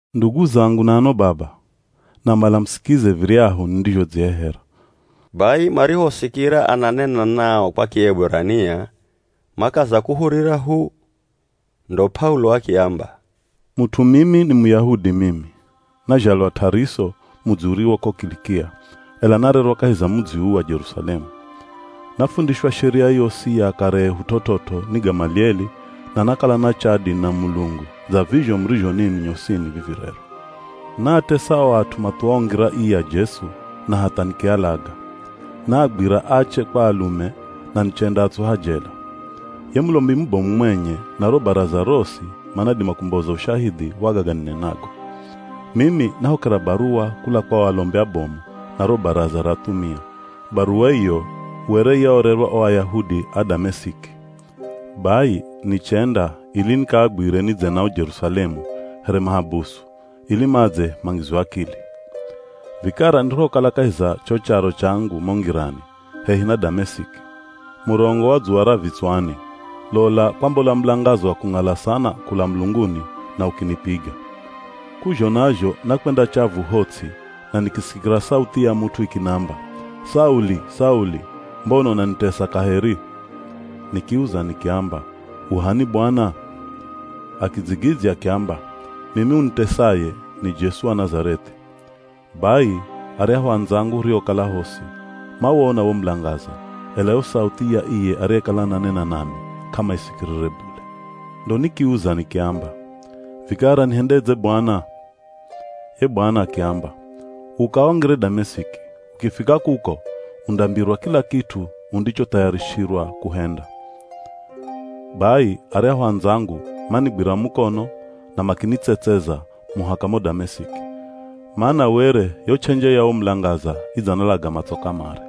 “Ndugu zangu na ano baba, namala musikize viryahu nindizhodzihehera.” Bai marihosikira ananena nao kwa Kieburania, makaza kuhurira hu. Ndo P'aulo akiamba, “Mut'u mimi ni Muyahudi mimi, nazhalwa T'ariso mudzi uriwo ko Kilikia, ela narerwa kahi za mudzi uu wa Jerusalemu. Nafundishwa sheria yosi ya akare ehu t'ot'ot'o ni Gamalieli na nakala na chadi na Mulungu dza vizho murizho ninwi nyosini vivi rero. Naatesa o at'u mathuwao Ngira ii ya Jesu na hatha nikialaga. Naagwira ache kwa alume na nichendaatsuha jela. Ye Mulombi mubomu mwenye na ro Baraza rosi manadima kumboza ushahidhi wa gaga ninenago. Mimi nahokera baruwa kula kwa o alombi abomu na ro Baraza ra athumia, baruwa iyo were yaorerwa o Ayahudi a Damesiki. Bai nichenda ili nikaagwire, nidze nao Jerusalemu here mahabusu ili madze mangizwe akili. Vikara nirihokala kahi za cho charo changu mo ngirani, hehi na Damesiki, murongo wa dzuwa ra vitswani, lola, kwambola mulangaza wa kung'ala sana kula mulunguni na ukinipiga. K'uzhona zho nakwenda chavu ho ts'i na nikisikira sauthi ya mut'u ikinamba, ‘Sauli! Sauli! Mbona unanitesa kaheri?’ Nikiuza nikiamba, ‘U h'ani, Bwana?’ Akidzigidzya akiamba, ‘Mimi unitesaye ni Jesu wa Nazareth'i.’ Bai aryahu andzangu huriokala hosi, mawona wo mulangaza, ela yo sauthi ya iye ariyekala ananena nami k'amaisikirire bule. Ndo nikiuza nikiamba, ‘Vikara nihendedze Bwana?’ Ye Bwana akiamba, ‘Uka wangire Damesiki, ukifika kuko undambirwa kila kit'u udzichothayarishirwa kuhenda.’ Bai aryahu andzangu manigwira mukono na makinitsetseza muhaka mo Damesiki, mana were yo ch'enje ya wo mulangaza idzanalaga matso kamare.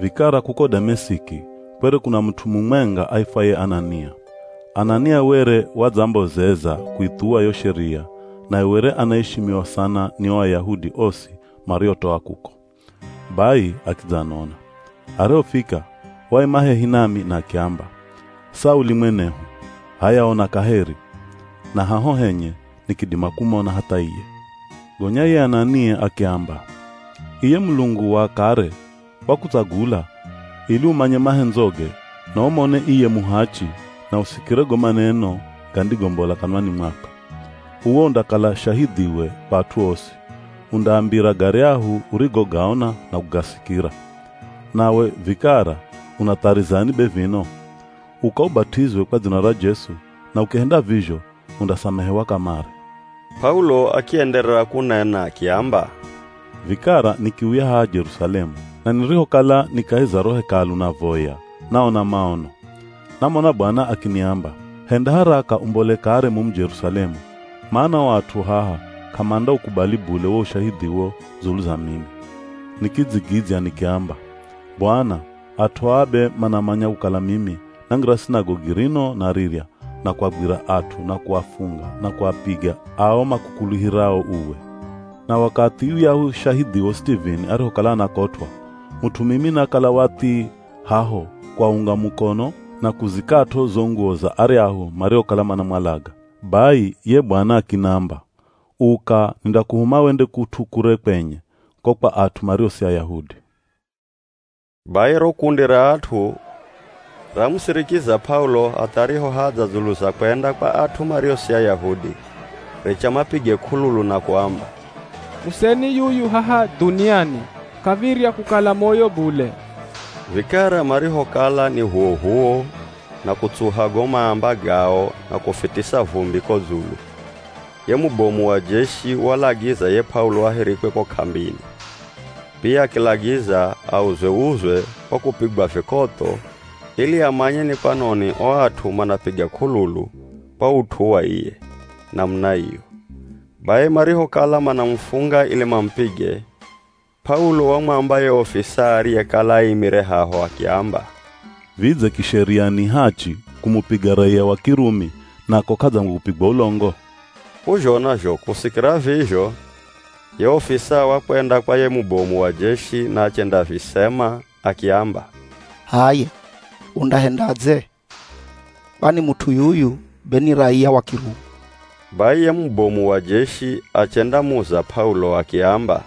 “Vikara kuko Damesiki kwere kuna mut'u mumwenga aifwaye Anania. Anania were wadzambozeza kuithuwa yo sheria naye were anaishimiwa sana ni o Ayahudi osi mariotoa kuko. Bai akidzanona. Arihofika, waima hehi nami na akiamba, ‘Sauli mwenehu h'aya ona kaheri!’ Na haho henye nikidima kumona hatha iye. Gonya ye Anania akiamba, ‘Iye Mulungu wa akare wakutsagula ili umanye mahendzoge na umone iye Muhachi na usikire go maneno gandigombola kanwani mwakwe. Uwe undakala shahidhiwe kwa at'u osi, undaambira garyahu urigogaona na kugasikira. Nawe vikara unatharizani be vino? Uka ubat'izwe kwa dzina ra Jesu na ukihenda vizho undasamehewa kamare.’” P'aulo akienderera kunena akiamba, “Vikara nikiuya haha Jerusalemu na nirihokala ni kahi za ro Hekalu navoya, naona maono. Namona Bwana akiniamba, ‘Henda haraka umbole kare mumu Jerusalemu, mana o at'u haha k'amandaukubali bule wo ushahidhiwo dzulu za mimi.’ Nikidzigidzya nikiamba, ‘Bwana, at'u aa be manamanya kukala mimi nangira Sinagogi rino na rirya na kuagwira at'u na kuafunga na kuapiga ao makukuluhirao uwe. Na wakathi yuyahu shahidhiwo Sitivini arihokala anakotw'a, mut'u mimi nakala wa thi, haho kuaunga mukono na kuzikat'o zo nguwo za aryahu mariokala manamwalaga.’ Bai ye Bwana akinamba, ‘Uka, nindakuhuma wende kut'u kure kwenye, ko kwa at'u mario si Ayahudi.’” Bai ro kundi ra at'u ramusirikiza P'aulo hatha arihohadza dzulu za kwenda kwa at'u mario si Ayahudi, richa mapige k'ululu na kuamba, “Museni yuyu haha dhuniani, k'av̱irya kukala moyo bule!” Vikara marihokala ni h'uwoh'uwo na kutsuha go maamba gao na kufitisa vumbi ko dzulu, ye mubomu wa jeshi walagiza ye P'aulo ahirikwe ko k'ambini. Pia akilagiza auzwe-uzwe kwa kupigwa vikotho ili amanye ni kwanoni o at'u manapiga k'ululu kwa ut'u wa iye, namuna iyo. Bai marihokala manamufunga ili mamupige, P'aulo wamwamba ye ofisaa ariyekala aimire haho akiamba, “Vidze kisheria ni hachi, kumupiga raiya wa Kirumi na ko k'adzangwe kupigwa ulongo?” K'uzhona zho kusikira vizho, ye ofisaa wakwenda kwa ye mubomu wa jeshi na achendavisema, akiamba, “H'aya, undahendadze, kwani mut'u yuyu be ni raiya wa Kirumi.” Bai ye mubomu wa jeshi achendamuza P'aulo akiamba,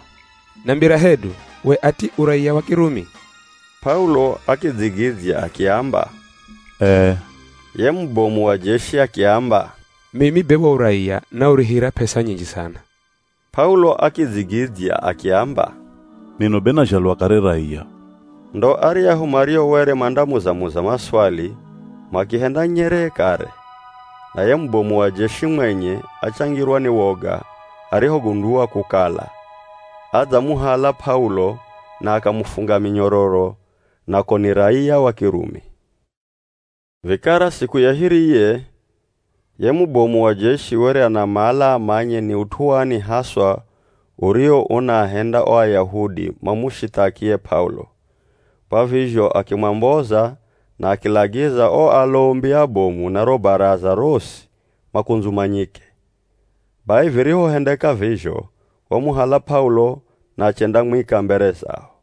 “Nambira hedu, we ati u raiya wa Kirumi?” P'aulo akidzigidzya akiamba, “Ee.” Ye mubomu wa jeshi akiamba, “Mimi be wo uraiya naurihira p'esa nyinji sana.” P'aulo akidzigidzya akiamba, “Mino be nazhalwa kare raiya.” Ndo aryahu mario were mandamuza-muza maswali makihenda nyeree kare, na ye mubomu wa jeshi mwenye achangirwa ni woga arihogundua kukala, adzamuhala P'aulo na akamufunga minyororo na ko ni raiya wa Kirumi. Vikara siku ya hiriye, ye mubomu wa jeshi were anamala amanye ni ut'u wani haswa uriwo unaahenda o Ayahudi mamushithaki ye P'aulo, kwa vizho akimwamboza na akilagiza o alombi abomu na ro Baraza rosi makundzumanyike. Bai virihohendeka vizho, wamuhala P'aulo na achendamwika mbere zao.